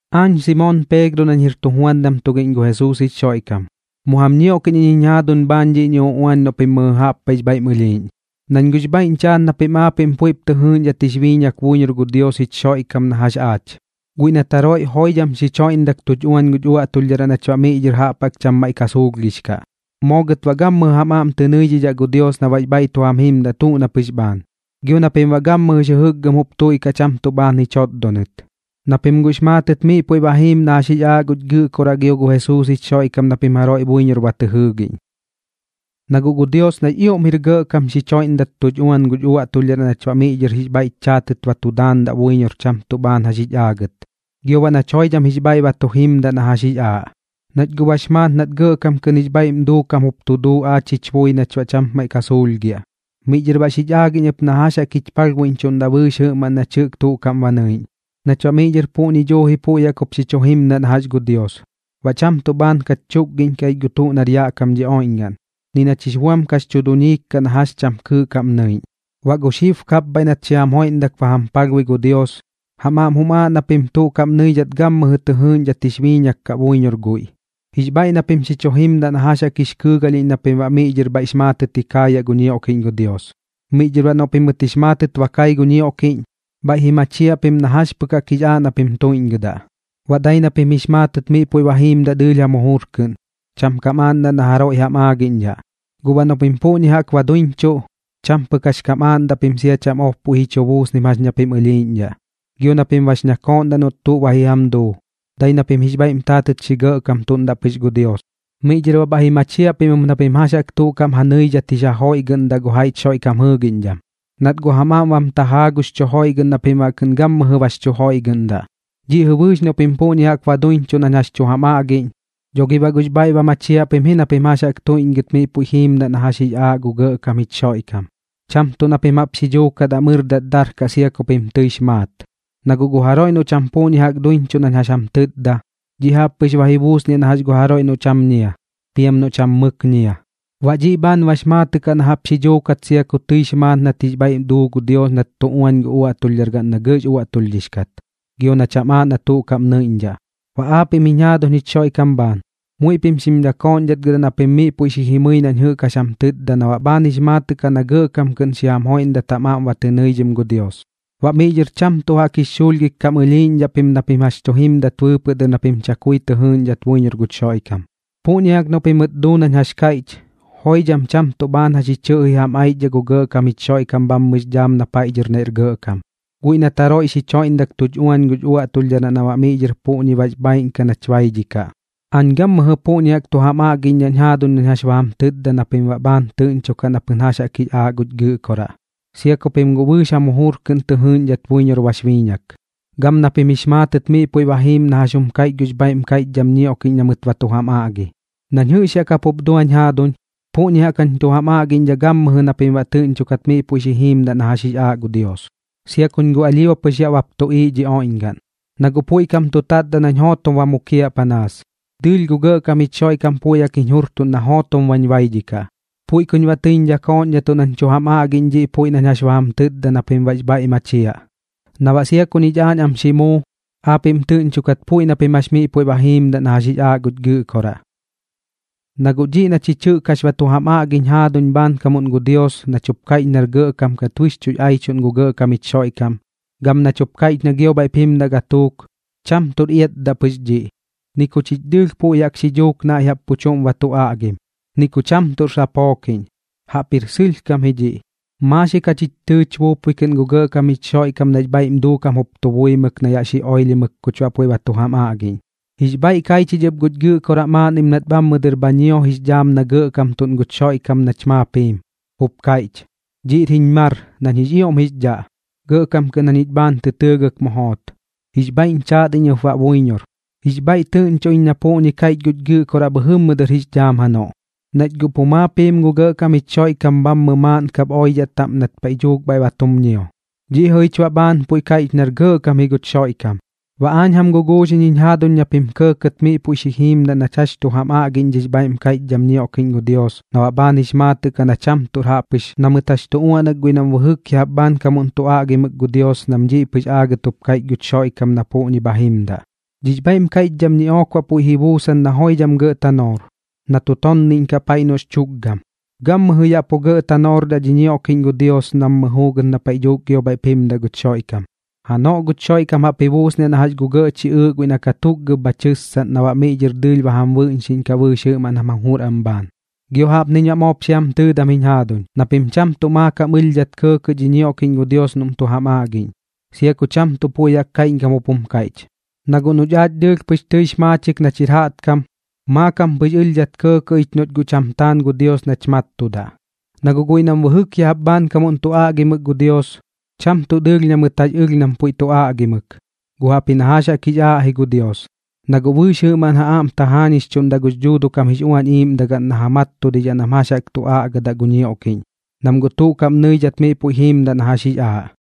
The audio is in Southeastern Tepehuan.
Aañ Simoon Peegro nañ jir tujuandam tugiꞌñ gu Jesuus jich Xoiꞌkam, mu jam ñioꞌkiꞌñ iñ jiñ jaaduñ bhaan dhiꞌñi uꞌuan noꞌ pim mɨjɨ jaꞌp paiꞌx bhaiꞌm ɨlhiiꞌñ, nañ guꞌx bhaiꞌñ chaat na pim aapiꞌm puiꞌp tɨ jɨɨꞌñdhat jix biiñak buiñor gu Dios jich Xoiꞌkam na jax aach, guiꞌ nat jaroiꞌ joidham xich joiꞌndak tuch uañ guch uaꞌtulhdharaꞌ nach baꞌ miꞌ dhɨr jaꞌp jaꞌk cham maiꞌ ka suulhgix kaꞌ. Moo gɨt baꞌ gammɨjɨ jam aꞌm tɨ nɨidhidhaꞌ gu Dios na baꞌx bhaiꞌ tu jam jimdaꞌ tuꞌ na pɨx bhaan, gio na pim baꞌ gammɨjɨx jɨjɨkgɨm jup tuiꞌkaꞌ cham tuꞌ bhaan ji chotdonɨt, na pim guꞌx maatɨt miꞌ puiꞌ ba jiim na jax jix aaꞌ guch Gɨꞌkoraꞌ gio gu Jesuus jich Xoiꞌkam na pim jaroiꞌ buiñor ba tɨ jɨɨgiꞌñ. Na guꞌ gu Dios nax ioꞌm jir gɇꞌkam xich joiꞌndak tuch uañ guch uaꞌtulhdharaꞌ nach baꞌ miꞌ dhɨr jix bhaiꞌch chaatɨt ba tu daandaꞌ buiñor cham tuꞌ bhaan jax jich aagɨt, gio baꞌ nach joidham jix bhaiꞌ ba tu jimdaꞌ na jax jix aaꞌ, nach guꞌ bax maat nat gɇꞌkam kɨꞌn jix bhaiꞌm duukam jup tu duu aach jich bui nach baꞌ cham maiꞌ ka suulhgiaꞌ. Miꞌ dhɨr baꞌ xich aagiꞌñ ɨp na jax jaꞌk jich palhbuiꞌñchuꞌndaꞌ bɨɨx jɨꞌmaꞌn nach jɨꞌk tuꞌ kaꞌm ba nɨiꞌñ, nach baꞌ miꞌ dhɨr puꞌñi duuji puiꞌ jaꞌk jup xi chu jimdaꞌ na jax gu Dios, baꞌ cham tuꞌ bhaan kach chutkagiꞌñkaꞌ ich gu tuꞌ nar yaꞌ kam dhi oiꞌñgaꞌn, ni nach jix buam kax chu duñiik kaꞌ na jax cham kɨɨꞌ kaꞌm nɨiꞌñ. Baꞌ gu xib kapbhaiꞌ nat xi jam joiꞌndak ba jam palhbui gu Dios, jam aꞌm jum aaꞌ na pim tuꞌ kaꞌm nɨidhat gammɨjɨ tɨ jɨɨꞌñdhat jix biiñak kaꞌ buiñor guiꞌ, jix bhaiꞌ na pim xi chu jimdaꞌ na jax jaꞌk jix kɨɨgalhiꞌñ na pim baꞌ miꞌ dhɨr bhaiꞌx maatɨt ji kaayaꞌ gu ñioꞌkiꞌñ gu Dios. Miꞌ dhɨr baꞌ noꞌ pimɨt jix maatɨt ba kai gu ñioꞌkiꞌñ, bhaiꞌp ji machiaꞌ pim na jax pɨk jaꞌk jix aaꞌ na pim tuiꞌñgɨdaꞌ, baꞌ dai na pim jix maatɨt miꞌ puiꞌ ba jiimdaꞌ dɨɨlh jam jujur kɨꞌn, cham kam aaꞌndaꞌ na jaroiꞌ jam aagiꞌñdhaꞌ. Guꞌ baꞌ noꞌ pim puꞌñi jaꞌk ba duiñchuꞌ, cham pɨk jax kam aaꞌndaꞌ pim sia cham ob puiꞌ ji chu buusnim jax ña pim ɨlhiiꞌñdhaꞌ, gio na pim bax ñakooꞌndaꞌ noꞌt tuꞌ ba ji jam duu, dai na pim jix bhaiꞌm taatɨt xi gɇꞌkamtuꞌndaꞌ pɨx gu Dios. Miꞌ dhɨr baꞌ bhaiꞌ ji machiaꞌ pim ɨp na pim jax jaꞌk tuꞌ kaꞌm ja nɨidhat jix ja joiꞌgɨꞌndaꞌ gu jaiꞌch Xoiꞌkam jɨɨgiꞌñdham, nat guꞌ jam aꞌm bam tajaa gux chu joiꞌgɨꞌn na pim baꞌ kɨꞌn gammɨjɨ bax chu joiꞌgɨꞌndaꞌ. Dhiꞌ jɨꞌ bɨɨx noꞌ pim puꞌñi jaꞌk ba duiñchuꞌ nañ jax tu jam aꞌgiꞌñ, dho gi baꞌ guꞌx bhaiꞌ ba machiaꞌ pim ji na pim jax jaꞌk tuiꞌñgɨt miꞌ puiꞌ jiimdaꞌ na jax jaꞌk jix aaꞌ gu Gɇꞌkam jich Xoiꞌkam, cham tuꞌ na pim jaꞌp xi dhuukat am ɨrdat darkaꞌ sia ku pim tɨix maat. Na guꞌ gu jaroiꞌ noꞌ cham puꞌñi jaꞌk duiñchuꞌ nañ jax jam tɨtda, dhiꞌ jaꞌp pɨx ba ji buusniaꞌ na jax gu jaroiꞌ noꞌ cham ñia, piam noꞌ cham mɨk ñia. Baꞌ dhiꞌ bhaan bax maatɨꞌ kaꞌ na jaꞌp xi dhuukat sia ku tɨix maat nat jix bhaiꞌ duu gu Dios nat tu uañ gu uaꞌtulhdhargaꞌn na gɇꞌx uaꞌtulhdhix kat, gio na cham aaꞌ na tuꞌ kaꞌm nɨiꞌñdhaꞌ. Baꞌ aapiꞌm jiñ jaaduñ jich Xoiꞌkam bhaan, muiꞌ pim xim dɨkooꞌñdhatgɨdaꞌ na pim miꞌ puiꞌ xi jimɨi nañ jɨꞌk jax jam tɨtda na baꞌ bhaan jix maatɨꞌ kaꞌ na gɇꞌkam kɨꞌn xi jam joiꞌndat jam aꞌm ba tɨ nɨidhim gu Dios. Baꞌ miꞌ dhɨr cham tuꞌ jaꞌk jix xuulhgik kam ɨlhiiꞌñdhaꞌ pim na pim jax tu jimdat bɨɨpɨꞌ dɨr na pim chakui tɨ jɨɨꞌñdhat buiñor guch Xoiꞌkam. Puꞌñi jaꞌk noꞌ pimɨt duu nañ jax kaiꞌch, joidham cham tuꞌ bhaan jax ji chɨꞌji jam aichdhaꞌ gu Gɇꞌkam jich Xoiꞌkam bhammɨx dhaam na paiꞌ dhɨr naiꞌr gɇꞌkam, guiꞌ nat jaroiꞌ xich joiꞌndak tuch uañ guch uaꞌtulhdharaꞌ na baꞌ miꞌ dhɨr puꞌñi bax bhaaiꞌn kaꞌ nach baidhikaꞌ. Aañ gammɨjɨ puꞌñi jaꞌk tu jam aꞌgiꞌñdhaꞌñ jaaduñ nañ jax ba jam tɨtda na pim baꞌ bhaan tɨꞌñchokaꞌ na pɨn jax jaꞌk jix aaꞌ guch Gɨꞌkoraꞌ, sia ku pim guꞌ bɨɨx jam jujur kɨꞌn tɨ jɨɨꞌñdhat buiñor bax biiñak, gam na pim jix maatɨt miꞌ puiꞌ ba jiim na jax jum kaiꞌch gux bhaiꞌm kaiꞌchdham ñioꞌkiꞌñ na mɨt ba tu jam aꞌgi. Nañ jɨꞌx yaꞌ kapup duañ jaaduñ, puꞌñi jaꞌk jañ tu jam aꞌgiꞌñdhaꞌ gammɨjɨ na pim baꞌ tɨꞌñchokat miꞌ puiꞌ xi jiimdaꞌ na jax jix aaꞌ gu Dios, sia kuñ guꞌ alhio pɨx yaꞌ bap tuꞌiiꞌ dhi oiꞌñgaꞌn. Na guꞌ puiꞌ kam tu tatdaꞌ nañ jootom ba mukiaꞌ panaas, dɨɨlh gu gɇꞌkam jich Xoiꞌkam puiꞌ jaꞌk jiñ jurtuꞌn na jootom bañ baidhikaꞌ. Puiꞌ kuñ baꞌ tɨiñ dhɨkooꞌñdhatuꞌ nañ tu jam aꞌgiꞌñ dhiꞌ puiꞌ nañ jax ba jam tɨtda na pim baꞌx bhaiꞌ machiaꞌ, na baꞌ sia ku ñich aañ am xi muu, aapiꞌm tɨꞌñchokat puiꞌ na pim jax miꞌ puiꞌ jiimdaꞌ na jax jix aaꞌ guch Gɨꞌkoraꞌ. Na guꞌ dhiꞌ na chich jɨꞌk jax ba tu jam aꞌgiñ jaaduñ bhaankamuꞌn gu Dios nach jup kaiꞌch nar gɇꞌkam kat bɨxchuꞌx aichuꞌn gu Gɇꞌkam jich Xoiꞌkam, gam nach jup kaiꞌch na gio bhaiꞌp jimdaꞌ gatuuk, cham tuꞌr iatdaꞌ pɨx dhiꞌ, ni ku chich dɨɨlh puiꞌ jaꞌk xi duuk naiꞌ jaꞌp pu chuꞌm ba tu aꞌgim, ni ku cham tuꞌr sapookiꞌñ. Jaꞌpjir sɨlhkam ji dhiꞌ, maaxik jachich tɨɨch buupui kɨꞌn gu Gɇꞌkam jich Xoiꞌkam nax bhaiꞌm duukam jup tu buimɨk na yaꞌ xi oilhimɨk kuch baꞌ puiꞌ ba tu jam aꞌgiꞌñ. Jix bhaiꞌ kai chich ɨp guch Gɨꞌkoraꞌ maaꞌnnim nat bhammɨ dɨr ba ñio jix dhaam na gɇꞌkamtuꞌn guch Xoiꞌkam nach maap jiim, jup kaiꞌch: “Dhiꞌr jiñ mar nañ jix ioꞌm jix dhaꞌ, gɇꞌkam kɨꞌn jañich bhaan tɨ tɨɨgɨk mu joot. Jix bhaiꞌñ chaat iñ ɨp baꞌ buiñor.” Jix bhaiꞌ tɨꞌñcho ich na puꞌñi bha kaiꞌch guch Gɨꞌkoraꞌ bhɨjɨmmɨ dɨr jix dhaam janoꞌ, nach guꞌ pu maap jiim gu Gɇꞌkam jich Xoiꞌkam bhammɨ maaꞌn kap oidhaꞌ taꞌm nat paiꞌ dhuuk bhaiꞌ ba tum ñio. Dhiꞌ jɨꞌ jich baꞌ bhaan puiꞌ kaiꞌch nar gɇꞌkam ji guch Xoiꞌkam. Baꞌ aañ jam guguuxiꞌñ jiñ jaaduñ na pim kɇɇkɇt miꞌ puiꞌ xi jiimdaꞌ nach jax tu jam aꞌgiꞌñ dhix bhaiꞌm kaiꞌchdham ñioꞌkiꞌñ gu Dios na baꞌ bhaan jix maatɨꞌ kaꞌ na cham tuꞌr jaꞌp pɨx na mɨt jax tu uaꞌnak guiꞌ nam bɨjɨk ya jaꞌp bhaankamuꞌn tu aꞌgimɨk gu Dios nam dhiꞌ pɨx aagɨt jup kaiꞌch guch Xoiꞌkam na puꞌñi bha jimdaꞌ. Dhix bhaiꞌm kaiꞌchdham ñiꞌook baꞌ puiꞌ ji buusan na joidham gɇꞌ tanoor, na tu tonniꞌñkaꞌ paiꞌ noꞌx chukgam. Gammɨjɨ yaꞌ pu gɇꞌ tanoordaꞌ dhi ñioꞌkiꞌñ gu Dios nammɨ juugɨt na paiꞌ dhuuk gio bhaiꞌp jimdaꞌ guch Xoiꞌkam. Janoꞌ guch Xoiꞌkam jaꞌp ji buusniaꞌ na jax gu gɇꞌ chiꞌɨɨꞌ guiꞌ na katukgab bha tɨssaꞌn na baꞌ miꞌ dhɨr dɨɨlh ba jam bɨꞌñxiꞌñkaꞌ bɨɨx jɨꞌmaꞌn jam jujur am bhaan. Gio jaꞌpniñ baꞌ moop xi jam tɨɨdam jiñ jaaduñ, na pim cham tuꞌ maakam ɨlhdhat kɇɇkɇꞌ dhi ñioꞌkiꞌñ gu Dios noꞌm tu jam aꞌgiꞌñ, sia ku cham tuꞌ puiꞌ jaꞌk kaiꞌñkam jup jum kaiꞌch. Na guꞌ noꞌch aach dɨɨlh pɨx tɨix maachik nach jir jaꞌtkam, maakam pɨx ɨlhdhat kɇɇkɇꞌ ich noꞌch guꞌ cham taan gu Dios nach mattudaꞌ. Na guꞌ guiꞌ nam bɨjɨk ya jaꞌp bhaankamuꞌn tu aꞌgimɨk gu Dios, cham tuꞌ dɨɨlh na mɨt jax ɨlh nam puiꞌ tu aꞌgimɨk, guꞌ jaꞌpji na jax jaꞌk jix aaꞌ ji gu Dios, na guꞌ bɨɨx jɨꞌmaꞌn ja aꞌm tajaañixchuꞌndaꞌ gux Dhuuduꞌ kam jix Uañ Iiꞌmdagaꞌn na ja mattudidhaꞌ nam jax jaꞌk tu aꞌgadaꞌ gu ñioꞌkiꞌñ, nam guꞌ tuꞌ kaꞌm nɨidhat miꞌ puiꞌ jiimdaꞌ na jax jix aaꞌ.